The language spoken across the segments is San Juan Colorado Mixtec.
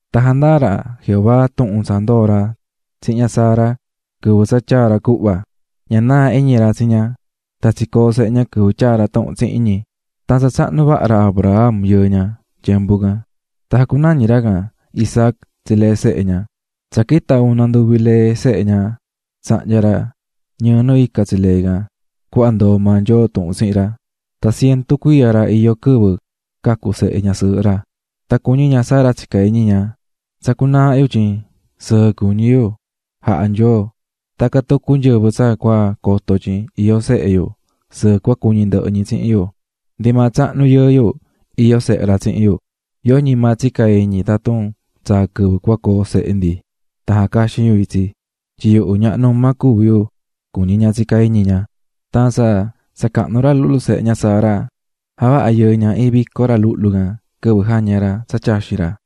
Tan jandaa̱ ra Jehová tuhun tsa ndoo̱ ra tsihin ña Sara quɨvɨ tsa tyaa̱ ra cuhva, ña naa̱ iñi ra tsi ña. Tan tsicoo̱ sehe ña quɨvɨ tyaa̱ ra tuhun tsihin ñi, tan tsa tsahnu vaha ra Abraham, yɨɨ ña, tyembu can. Tan jacunañi̱ ra Abraham Isaac tsi lee sehe ñi. Tsa quita̱ una nduvi lee can, tsahnya̱ ra ñɨɨ nu ica tsi lee can, cuhva ndoo̱ maa Nyoo tuhun tsihin ra. Tan cientu cuiya ra iyó quɨvɨ cacu̱ ra Isaac. Tan cuñí ña Sara tsicá iñi ña: "Tsacú naaha yu tyin sɨɨ cuñí yu jaha̱ Nyoo, tan tacan tucu nyɨvɨ tsa cua coto tyin iyó sehe yu, sɨɨ cua cuñi ndɨhɨ ñi tsihin yu. Ndi maa tsahnu yɨɨ yu iyó sehe ra tsihin yu. Yoñi maa tsica̱ iñi tatun tsaa quɨvɨ coo sehe ndi tan jacaxin yu itsi, tyin yuhu ñaha numa cuví yu", cuñí ña tsicá iñi ña. Tan tsa tsa cahnu ra luhlu sehe ñi, javaha̱ ra Abraham vico ra quɨvɨ jaña̱ ra tsa tyaxín ra.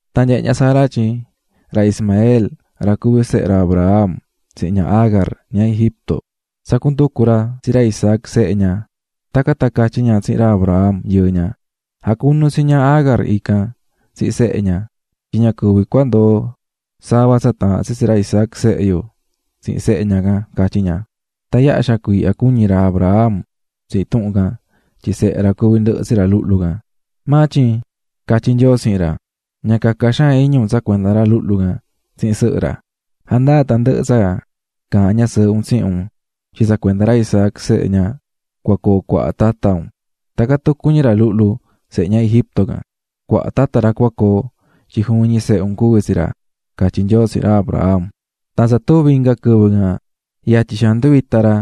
Tan nyehe̱ ña Sara tyin ra Ismael, ra cuví sehe ra Abraham tsihin ña Agar, ña Egipto, tsacú nducu ra tsi ra Isaac, sehe ña. Tacan tan catyí ña tsihin ra Abraham, yɨɨ ña: "Ja̱cunu tsi ña Agar tsihin sehe ña, tyin ña cuvi ndoo sava tsa taahán tsi ra Isaac sehe yo tsihin sehe ña can", catyí ña. Tan yaha xaan cuiihya cuñi̱ ra Abraham tsihin tuhun can tyin sehe ra cuví ndɨhɨ tsi ra luhlu can. Maa tyin catyí Nyoo tsihin ra: "Ña caca xaan iñi un tsa cuenda ra luhlu can tsihin sɨhɨ ra. Ja̱ndaa tandɨhɨ tsa caahán ñasɨɨhɨ un tsihin un tyin tsa cuenda ra Isaac, sehe ña, cua coo cuaha tata un. Tacan tucu ñi ra luhlu, sehe ña Egipto can, cuaha tata ra cua coo tyin juvin ñi sehe un cuví tsi ra", catyí Nyoo tsihin ra Abraham. Tan tsa tuvi̱ inga quɨvɨ can, yatyi xaan nduvita̱ ra,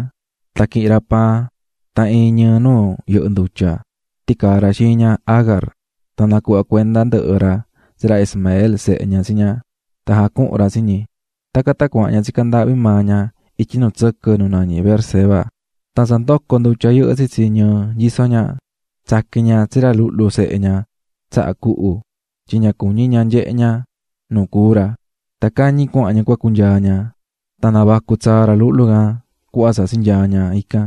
tan quihi̱n ra paan tan iin ñɨɨ nu yɨhɨ́ ndutya ticaa̱ ra xiin ña Agar, tan nacuhva̱ cuenda ndɨhɨ ra tsi ra Ismael, sehe ña tsi ña, tan jacuhu̱n ra tsi ñi. Tacan tan cuahan ña tsicá ndaahvi maa ña ityi nu tsɨquɨ nu nañí Beerseba. Tan tsa ndoco̱ ndutya yɨhɨ́ tsitsi ñɨɨ nyisó ña, tsaqui̱n ña tsi ra luhlu sehe ña tsaha cuhu. Tyin ña cuñí ña nyehe ña nu cúu ra, tan cañi cuahan ña cua cunyaa ña. Tan navacu̱ tsaa ra luhlu can cuhva tsa tsinyaa̱ ña ican.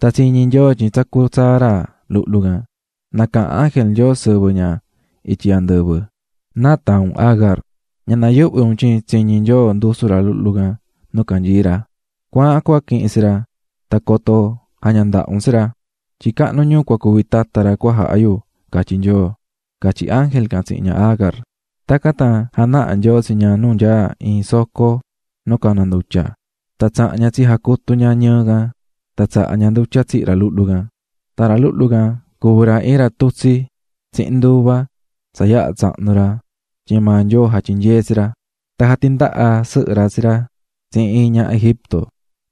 Tan tsiñi̱ Nyoo tyin tsacú tsaa ra luhlu can, nacaha̱n ángel Nyoo sɨvɨ ña ityi andɨvɨ: "¿Náa taahán un, Agar? Ña na̱yuhvi un, tsiñi̱ Nyoo tsacú ra luhlu can. Cua̱ahan cua quihin tsi ra tan coto jaña ndaha un tsi ra tyin cahnu ñuu cua cuvi tata ra cua jaha yu, catyí Nyoo", catyí ángel can tsihin ña Agar. Tacan tan janaha̱ Nyoo nu nyaá iin soco nu caná ndutya tsi ña, tan tsaha̱n ña tsijacutu̱ ña ñɨɨ ndaha ña, tan tsaha̱ ña ndutya tsihi̱ ra luhlu sehe ña. Tan ra luhlu can cuvi̱ ra iin ra tutsí tsihin nduva tsa yaha̱ tsahnu̱ ra tyin maa Nyoo jatyinyee̱ tsi ra. Tan jatindaha̱ sɨhɨ ra tsi ra tsihin iin ñaha Egipto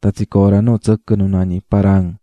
tan tsicoo̱ ra nu tsɨquɨ nu nañí Parán.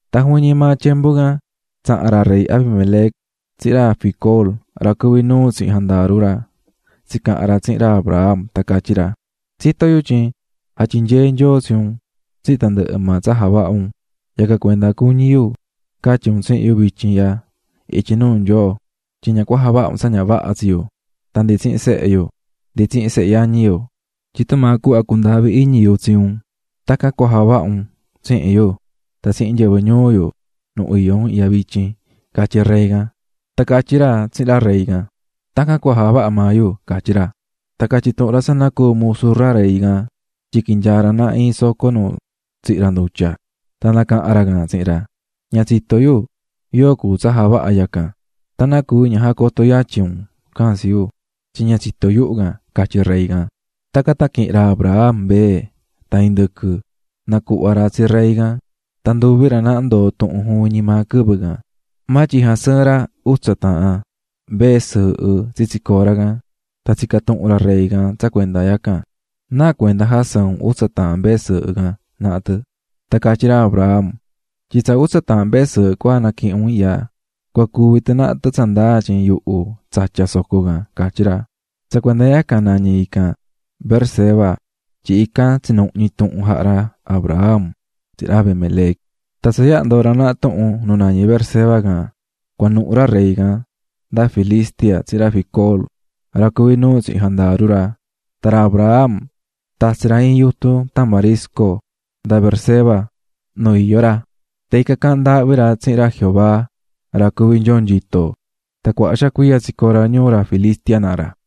Tan juvin ñi maa tyembu can, tsaha̱n ra rey Abimelec tsihin ra Ficol, ra cuví nuu tsihin jandaru ra, tsicaha̱n ra tsihin ra Abraham tan catyí ra: --Tsitó yu tyin jatyinyee̱ Nyoo tsi un tsihin tandɨhɨ maa tsa javahá un. Yacan cuenda cuñí yu catyi un tsihin yu vityin ihya ityi nuu Nyoo, tyin ña cua javaha un tsa ña vaha tsi yu, tan ndi tsihin sehe yu ndi tsihin sehe yañi yu, tyin tumaa cuhva cundaahvi̱ iñi yu tsi un, tacan cua javaha un tsihin yu tan tsihin nyɨvɨ ñuu yu, nu iyó un ihya vityin --catyí ra rey can. Tan catyí ra tsihin ra rey can: --Tacan cua javaha maa yu --catyí ra. Tan catyi̱ tuhun ra tsa nacuu̱ musu maa ra rey can tyin quinyaa̱ ra naha iin soco nu tsihí ra ndutya. Tan nacaha̱n ra can tsihin ra: --Ña tsitó yu yóo javaha̱ yacan, tan ¿náa cuvi ña jacoto̱ yatyi un can tsi yu?, tyin ña tsitó yuhu can --catyí rey can. Tacan tan quihi̱n ra Abraham mbee tan indɨquɨ nacuhva̱ ra tsi ra rey can, tan ndoo̱ nduvi ra naha tuhun juvin ñi maa quɨvɨ can. Maa tyin jasɨɨ̱n ra utsa taahan mbee sɨɨhɨ tsitsi cora can. Tan tsica̱ tuhun ra rey can tsa cuenda yacan: --¿Náa cuenda jasɨɨ̱n un utsa taahan mbee sɨɨhɨ can naha tɨ? Tan catyí ra Abraham: --Tyin tsa utsa taahan mbee sɨɨhɨ cua naquihin un ihya, cua cuvi tɨ naha tɨ tsa ndaa tyin yuhu tsatya̱ soco can --catyí ra. Tsa cuenda yacan nañí ican Beerseba tyin ican tsinuhñi̱ tuhun jaha̱ ra Abraham tsihin ra Abimelec. Tan tsa yaha ndoo̱ ra naha tuhun nu nañí Beerseba can, cuanuhu̱ ra rey can nda Filistia tsihin ra Ficol, ra cuví nuu tsihin jandaru ra. Tan ra Abraham tatsi̱ ra iin yutun tamarisco nda Beerseba nu iyó ra, tan ican caahán ndaahvi ra tsihin ra Jehová Nyoo nyito. Tan cuaha xaan cuiya tsicoo̱ ra ñuu ra Filistia naha ra.